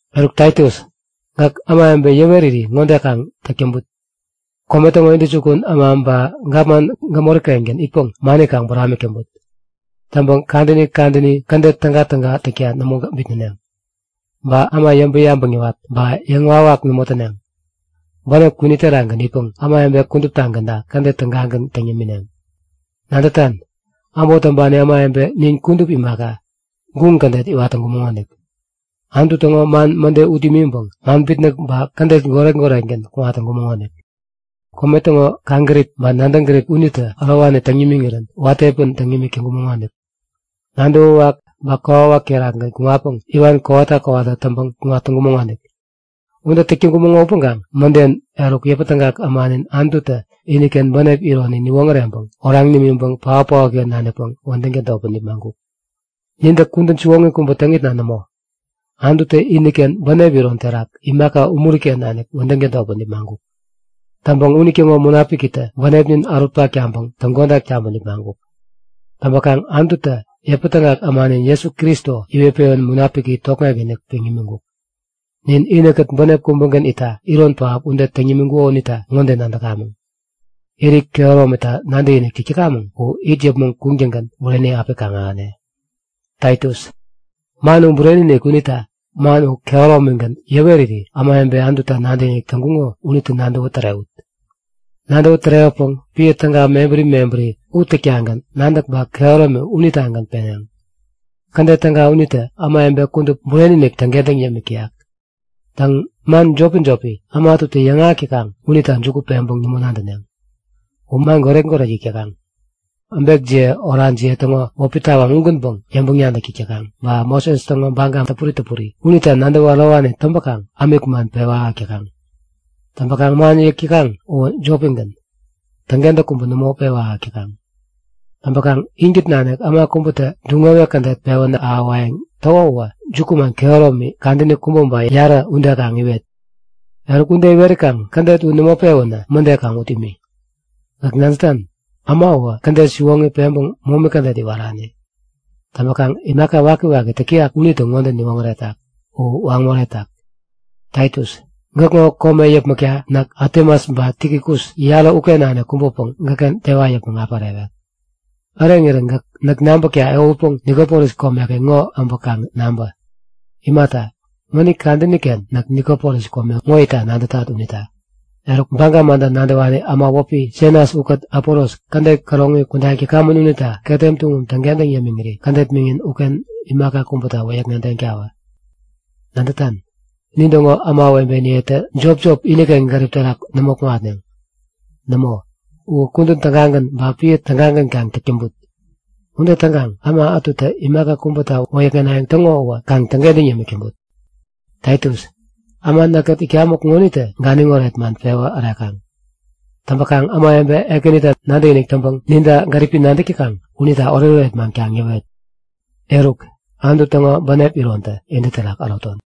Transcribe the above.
Eruk Taitus, gäk ämawebe yäweriri ŋode kaŋ täk täŋput; Kome täŋo intäjukun äma ba gapman gämori-kengän itpäŋ mani kaŋ buramik täŋput. Täŋpäŋ kadäni kadäni kädet tägatäga täkta nämo bitnäneŋ. Ba äma yäŋpäŋ-yabäŋ yäwat ba yäŋwawak nämo täneŋ. Bänep kwini terakgän itpäŋ ämawebe kuduptagänta kädet tägagän täŋ yämineŋ. Nadätan? Äbot täŋpani ämawebe nin kudup imaka, guŋ kädet iwat täŋkumäŋonik. Anutu täŋo man mäde ut imiŋpäŋ man bitnäk ba kädet goret-goret-gän kuŋat täŋkumäŋonik. Kome täŋo kaŋgärip ba nadäŋ gärip unitä ärowani täŋ nimiŋirän watä piä ude täŋ imik täŋkumäŋonik. Nadäwäwak ba kokwawak terakgän kuŋatpäŋ iwan kowata kowata täŋpäŋ kuŋat täŋkumäŋonik. Ude täk täŋkumäŋo upäŋkaŋ mäden, eruk yäpätägak ämanin Anututä iniken bänep ironi niwoŋäreŋpäŋ oraŋ nimiŋpäŋ paotpaotken nanikpäŋ wädäŋ tädotpäŋ nipmaŋkuk. Nintä kudän siwoŋi kubä täŋitna nämo, Anututä iniken bänep iron terak imaka umuri-ken nanik wädäŋ tädotpäŋ nipmaŋkuk. Täŋpäŋ unitäŋo Munapikitä bänepnin ärut nimiŋpäŋ täŋkodak taŋpäŋ nipmaŋkuk. Täŋpäkaŋ Anututä yäpätägak ämanin Jesu Kristo iwet-pewän Munapiki tokŋek-inik peŋ nimiŋkuk. Nin inikät bänep kubägän itta iron pähap ude täŋ nimiŋkuko unita ŋode nadäkamäŋ; Irit kehäromita nadäkinik täk täkamäŋ u it yäpmäŋ kuŋtäŋgän bureni api kaŋ-ahäne. Taitus, man u bureni-inik. Unita man u kehäromigän yäweriri ämawebe Anututa nadäkinik täŋkuŋo unitä nadäwä tärewut. Nadäwä tärewäpäŋ piä täga mebäri mebäri u täktagän nadäk ba kehäromi unitagän iŋitneŋ. Kädet täga unitä ämawebe kudup bureni-inik täŋkentäŋ yämik täyak. Täŋ, man jopi-jopi äma ätutä yäŋahäk täkaŋ unita juku peŋpäŋ nämo nadäneŋ; U man goret-goret yäk täkaŋ. Äbekjiye orajiye täŋo wäpi tawaŋ ugänpäŋ yäŋpäŋ-nadäk täk täkaŋ ba Moses täŋo baga täpuri täpuri unita nadäwä ärowani täŋpäkaŋ ämik man pewä ahäk täkaŋ. Täŋpäkaŋ man yäk täkaŋ uwä jopigän, täŋkentäk kubä nämo pewä ahäk täkaŋ. Täŋpäkaŋ inkät nanik äma kubätä duŋ-wewek kädet pewän ahäwayäŋ täko uwä jukuman kehäromi kadäni kubä ba yarä ude kaŋ iwet. Eruk, ude iwerikaŋ kädet u nämo pewänä mäde kaŋ ut imi. Gäk nadätan, äma uwä kädet siwoŋi peŋpäŋ momi kädet iwarani. Täŋpäkaŋ imaka wakiwaki täk täyak unitä ŋode niwoŋäretak; U waŋ moretak. Taitus, gäkŋo kome yäpmäkta näk Atemas ba Tikikus yarä uken nanik kubäpäŋ gäkken tewa yäpmäŋ api ärewek. Äreŋirän gäk näk nabäkta ehutpeŋ Nikopolis komeken ŋo äbä kaŋ nabä. Imata, mänit kadäni-ken näk Nikopolis kome ŋo itta nadätat unita. Eruk, baga manta nadäwani äma wäpi Senas ukät Apolos kädet käroŋi kudayäŋ täkamän unita ketem tuŋum täŋkentäŋ yämiŋiri kädet miŋin uken imaka kubäta wäyäkŋedeŋtawä. Nadätan? Nintäŋo ämawebeniyetä jopjop, iniken gärip terak nämo kuŋatneŋ. Nämo, u kudän tägagän ba piä tägagän kaŋ täk täŋput. Ude täŋkaŋ äma ätutä imaka kubäta wäyäkŋenayäŋ täŋo uwä kaŋ täŋkentäŋ yämik täŋput. Taitus, äma näkkät itkamäŋ ŋonitä ganiŋ oret man pewä ärekaŋ. Täŋpäkaŋ ämawebe Ekänita nadäkinik täŋpäŋ ninta gäripi nadäk täkaŋ unita oretoret man kaŋ yäwet. Eruk, Anutu täŋo bänep irontä intä terak äroton.